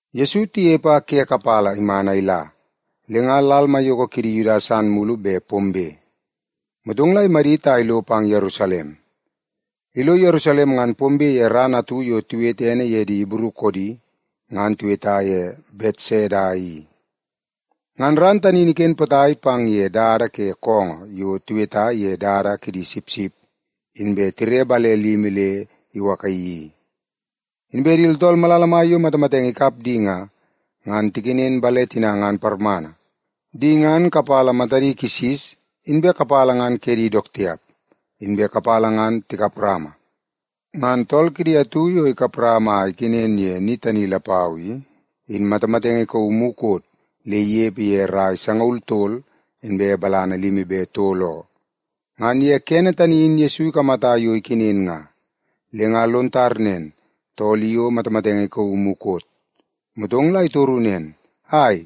Yesu inepe a ke kapala iman a ila, le nga lal maiyoko kidi Yuda san mulu bet pombe, motong la imadit a ilo pang Yerusalem. Ilo Yerusalem, ngan pombe ye ran atu yo tiwete ene ye di Ibru koodi, ngan tiweta ye Betseda i. Ngan ran tani in iken potai pang ye dada ke koongoo yo tiweta ye Dada Kidi Sipsip, inbe tire bale limi le iwakaii i. Inbe di tooltool malala mai yo matamatenge ikap di nga, ngan tikenen bale tina ngan parmana. Di ngan kapala matadi kisis, inbe kapala ngan kedi dook tiap, inbe kapala ngan tikap rama. Ngan tool kidi atu yo ikap rama a ikenen ye ni tani lapau i, in matamatenge ikauu mukot le inepe ye rai sangaul tol inbe balana limi be tol oo. Ngan ye kene tani in Yesu ikamata yo ikenen nga, le nga lon tar nen tool i o matamatenge ikauu mukot. Motong la itoru nen, “Ai,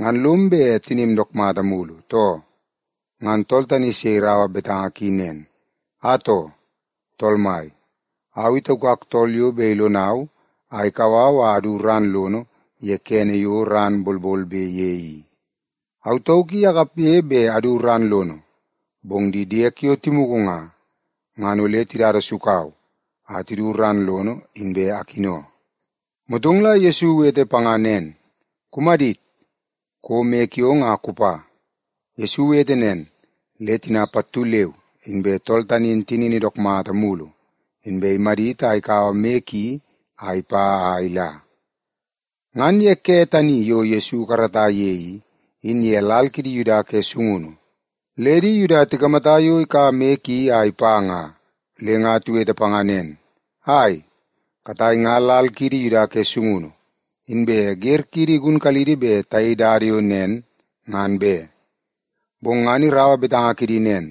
ngan lom bet tinim dook mulu, too?” Ngan tool tani se iraua betanga ki nen, “Atoo, tool mai, au i taukak tool yo bet ilonau a ikau au a adu ran lono ye kene yo ran bolbolbe ye i. Au tauk i akapge bet adu ran lono, bong di diek yo timugu nga, ngan ole tidada sukau a tidu ran lono, inbe akino.” Motong la Yesu iwete panga nen, “Kumadit! Kouo moi kiong a kupa.” Yesu iwete nen, le tina pattu leu inbe tool tani in tinini dook mata mulu, inbe imadit a ikaua moi ki a ipa a ila. Ngan ye ke tani yo Yesu ikarata ye i, in ye lal kidi Yuda ke sungunu, le di Yuda tikamata yo ikaua moi ki a ipa nga, le nga tiwete panga nen, “Ai, katai nga lal kiidi Yuda ke sungunu, inbe wer kiidi igunkalidi bet tayei dada yo nen ngan be.” Bong ngan iraua betanga kidi nen,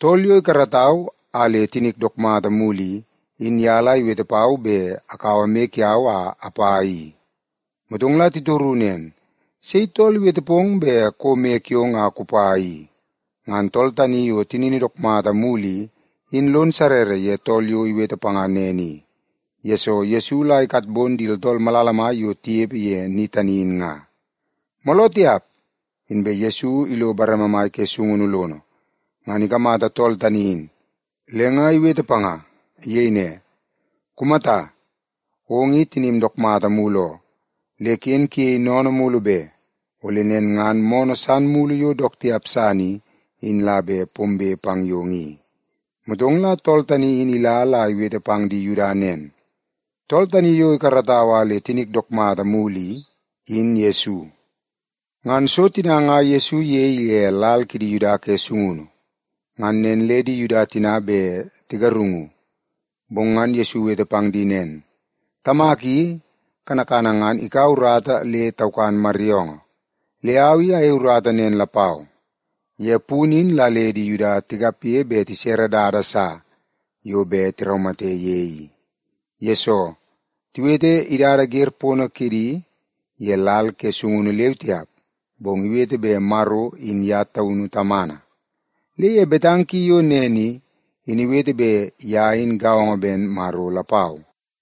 “Tool yo ikaratau a le tinik dook mata mulu i, in ye la iwete pau bet akaua moi kiau a apa i.” Motong la titoru nen, “Sei tool iwete pong bet kouo moi kiong a kupa i?” Ngan tool tani yo tinini dook mata mulu i, in lon sarrara ye tool yo iwete panga nen i, yesoo Yesu la ikatbon di tooltool malala mai yo tinepe ye ni tani in nga. Mooloo tiap, inbe Yesu ilo bareme mai ke sungunu lono, ngan ikamata tool tani in, le nga iwete panga. Iyei ne, “Kumata! Ong i tinim dook mata mulu oo. Le ken kuyei sennene mulu be. Ole nen ngan moonoo san mulu yo dook tiap san i, in la bet pombe pang yong i.” Motong la tool tani in ila la iwete pang di Yuda nen, “Tool tani yo ikaratau a le tinik dook mata mulu i, in Yesu.” Ngan so tina nga Yesu iyei ye lal kidi Yuda ke sungunu, ngan nen le di Yuda tina bet tigarungu. Bong ngan Yesu iwete pang di nen, “Tamak i, kanakana ngan ikaua urata le taukan maryoongoo. Le au i ayei urata nen lapau.” Ye punu in la le di Yuda tikapge bet tisere dada sa yo bet tiraumate ye i. Yesoo, tiwete idada wer pono kidi ye lal ke sungunu leu tiap, bong iwete bet Maro in ye taunu Tamana. Le ye betanga ki yo nen i, in iwete bet ye in gaongo ben Maro lapau.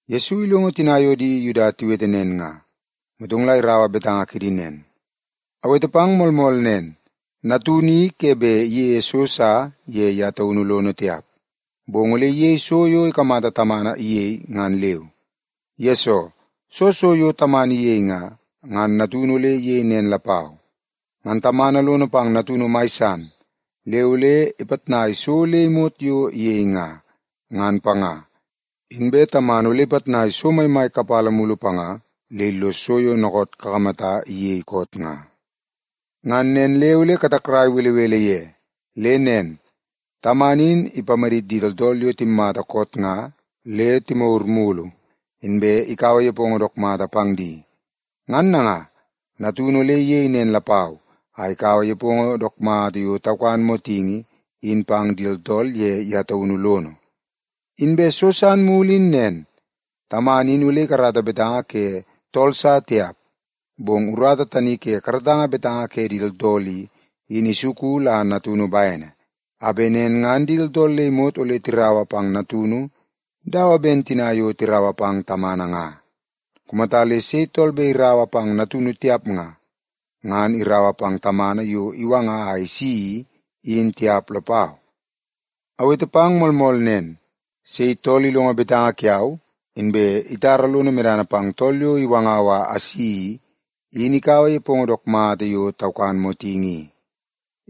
Yesu ilongo tina yo di Yuda tiwete nen nga, motong la iraua betanga kidi nen, “Awete pang moolmool nen, Natunu i ke bet iyeie so sa ye ye taunu lono tiap, bong ole iyei so yo ikamata Tamana iyei, ngan leu. Yesoo, soo so yo Tamana iyei nga, ngan Natunu ole iyei nen lapau. Ngan Tamana lono pang Natunu mai san le ole ipitnai so le imot yo iyei nga, ngan panga. Inbe Tamana ole ipitnai so maimai kapala mulu panga le illos so yo dookoot kakamata iyei koot nga. Ngan nen le ole katakrai belebele ye. Le nen, Tamana in ipamadit di tooltool yo timmata koot nga le timagur mulu, inbe ikaua nepongo dook mata pang di. Ngan nanga, Natunu ole iyei nen lapau a ikaua nepongo dook mata yo taukan motingi in pang di tooltool ye ye taunu lono. Inbe so san mulu in nen, Tamana in ole ikarata betanga ke tool sa tiap, bong urata tani ke karatanga betanga ke di tooltool i, in isuku la Natunu bene, a bet nen ngan di tooltool le imot ole tiraua pang Natunu dawa ben tina yo tiraua pang Tamana nga. Kumata le sei tool bet iraua pang Natunu tiap nga, ngan iraua pang Tamana yo iwanga a isi i, in tiap lapau.” “Awete pang moolmool nen, sei tool ilongo betanga kiau, inbe itara lono medana pang tool yo iwangau a asi i, in ikaua nepongo dook mata yo taukan motingi i.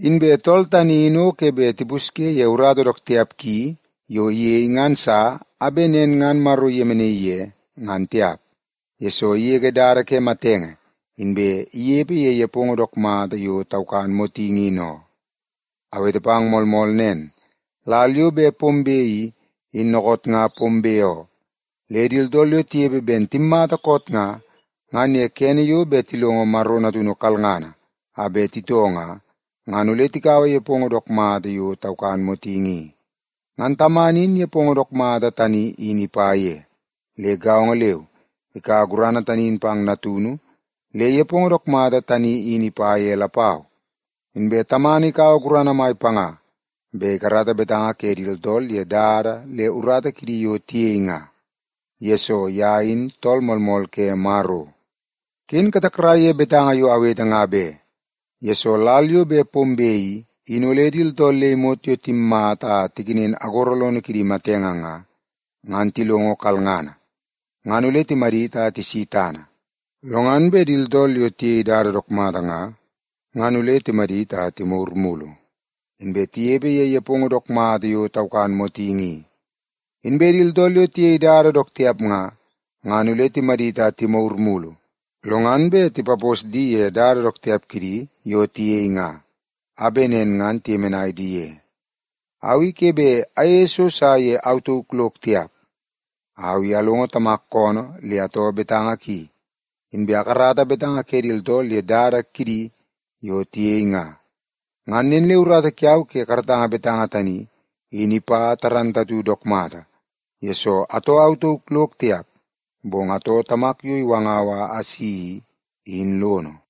Inbe tool tani in o ke bet tipaposi ye urata dook tiap ki yo iyei ngan sa, a bet nen ngan Maro iyemenaii ye, ngan tiap, yesoo igege dada ke matenge inbe inepe ye nepongo dook mata yo taukan motingi in oo. Awete pang moolmool nen, lal yo bet pombe i, in dookoot nga pombe oo. Le di tooltool yo tinepe ben timmata koot nga, ngan ye kene yo bet tilongo Maro Natunu kalngana a bet titoo nga, ngan ole tikaua nepongo dook mata yo taukan motingi i. Ngan Tamana in nepongo dook mata tani in ipa ye. Le gaongo leu ikaua gurana tani in pang Natunu le nepongo dook mata tani in ipa ye lapau. Inbe Tamana ikaua gurana mai panga bet ikarata betanga ke di tooltool ye dada le urata kidi yo tiyei nga, yesoo ye in Tool Moolmool ke Maro. “Ken katakrai ye betanga yo awete nga be. Yesoo, lal yo bet pombe i, in ole di tooltool le imot yo timmata a tikenen agoro lono kidi ke matenge nga, ngan tilongo kalngana, ngan ole timadit a tisi tana. Lo ngan bet di tooltool yo tiyei dada dook mata nga, ngan ole timadit a timagur mulu inbe tinepe ye nepongo dook mata yo taukan motingi i. Inbe di tooltool yo tiyei dada dook tiap nga, ngan ole timadit a timagur mulu, lo ngan bet tipapos di ye urata dook tiap kidi yo tiyei nga, a bet nen ngan tiyemenai di ye. Au i ke bet ayeie so sa ye au tauk lok tiap. Au i alongo Tamak koonoo le atoo betanga ki, inbe akarata betanga ke di tooltool ye dada kidi yo tiyei nga. Ngan nen le urata kiau ke karatanga betanga tani, in ipa dook mata, yesoo atoo au tauk lok tiap, bong atoo Tamak yo iwangau a asi i, in lono.”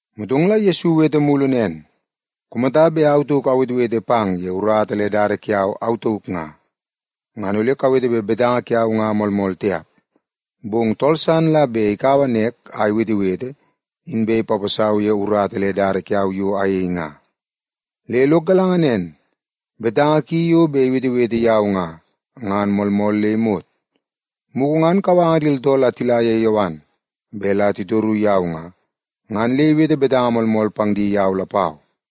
Motong la Yesu iwete mulu nen, “Kumata bet au tauk awetewete pang ye urata le dada kiau au tauk nga, ngan ole kawete bet betanga kiau nga moolmool tiap. Bong tool san la bet ikaua nek a iwetewete, inbe ipaposau ye urata le dada kiau yo ayei nga. Le lok galanga nen, betanga ki yo bet iwetewete yau nga, ngan moolmool le imot. Mugu ngan kawanga di tooltool a tila ye Yowan bet la titor yau nga, ngan le iwete betanga moolmool pang di yau lapau.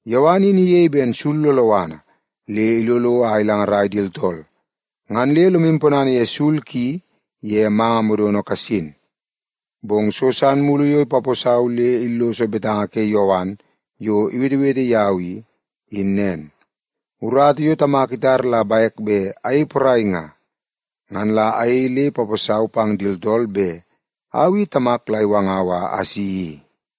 Yowan in iyei ben sul loloana le ilolo a ilangarai di tooltool. Ngan le lomu ponana ye sul ki ye manga modono kasin. “Bong so san mulu yo ipaposau le illos betanga ke Yowan yo iwetewete yau i, in nen. Urata yo Tamak itar la bek bet ayei porai nga, ngan la ayei le ipaposau pang di tooltool bet au i Tamak la iwangau a asi i.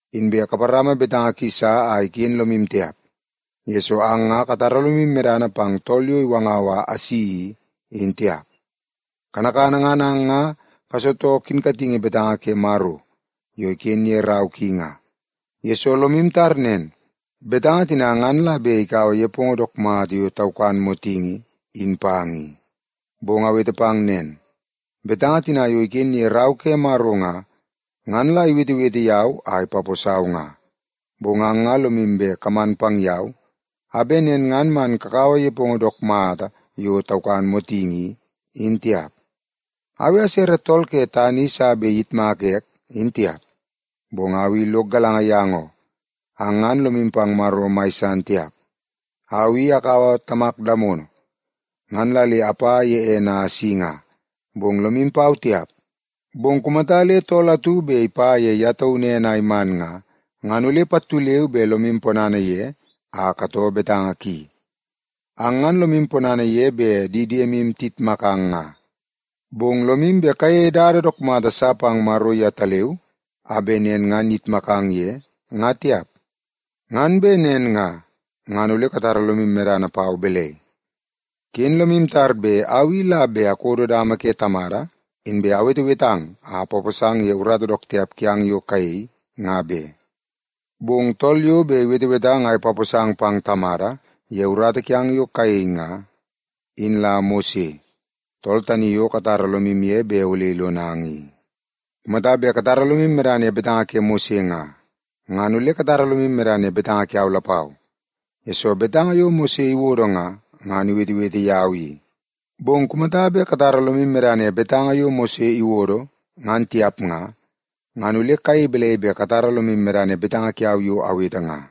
Inbe kaparama betanga ki sa a iken lomu tiap, yesoo ang nga katara lomu medana pang tool yo iwanga a isi i, in tiap. Kanakana ngan ang nga kasitoo kinkatingi betanga ke Maro yo iken ye rau ki nga, yesoo lomu tar nen, betanga tina ngan la bet ikaua nepongo dook mata yo taukan motingi in pang i. Bong awete pang nen, betanga tina yo iken ye Rau ke Maro nga, ngan la iwetewete yau a ipaposau nga. Bong ang nga lomu bet kaman pang yau, a bet nen ngan man kakaua nepongo dook mata yo taukan motingi i, in tiap. “Au i asere tool ke tana i sa bet iyitmaka ek, nga tiap, bong au i lok galanga yang oo. Ang ngan lomu pang Maro mai san tiap. Au i akaua Tamak damono ngan la le apa ye ene a asi nga, bong lomu pau tiap. Bong kumata le tool atu bet ipa ye ye taunu ene a iman nga, ngan ole pattu leu be lomu ponana ye a katoo betanga ki. Ang ngan lomu ponana yo bet di diemu tiyitmakang nga, bong lomu bet kayeie dada dook mata sa pang Maro yetaleu, a bet nen ngan iyitmakang ye, nga tiap. Ngan bet nen nga, ngan ole katara lomu medana pau balai? “Ken lomu tar bet au i la bet lo kakodo dama ke Tamada, inbe awetewetang a apaposang ye urata dook tiap kiang yo kayei, nga be. Bong tool yo bet iwetewetang a ipaposang pang Tamada ye urata kiang yo kayei nga, in la Mose, tool tani yo katara lomu ye bet ole ilonang i. Kumata bet katara lomu medana ye betanga ke Mose nga, ngan ole katara lomu medana ye betanga kiau lapau, yesoo betanga yo Mose iwodo nga, ngan iwetewete yau i. Bong kumata bet katara lomu medana ye betanga yo Mose iwodo, ngan tiap nga, ngan ole kayei balai bet katara lomu medana ye betanga kiau yo awete nga?”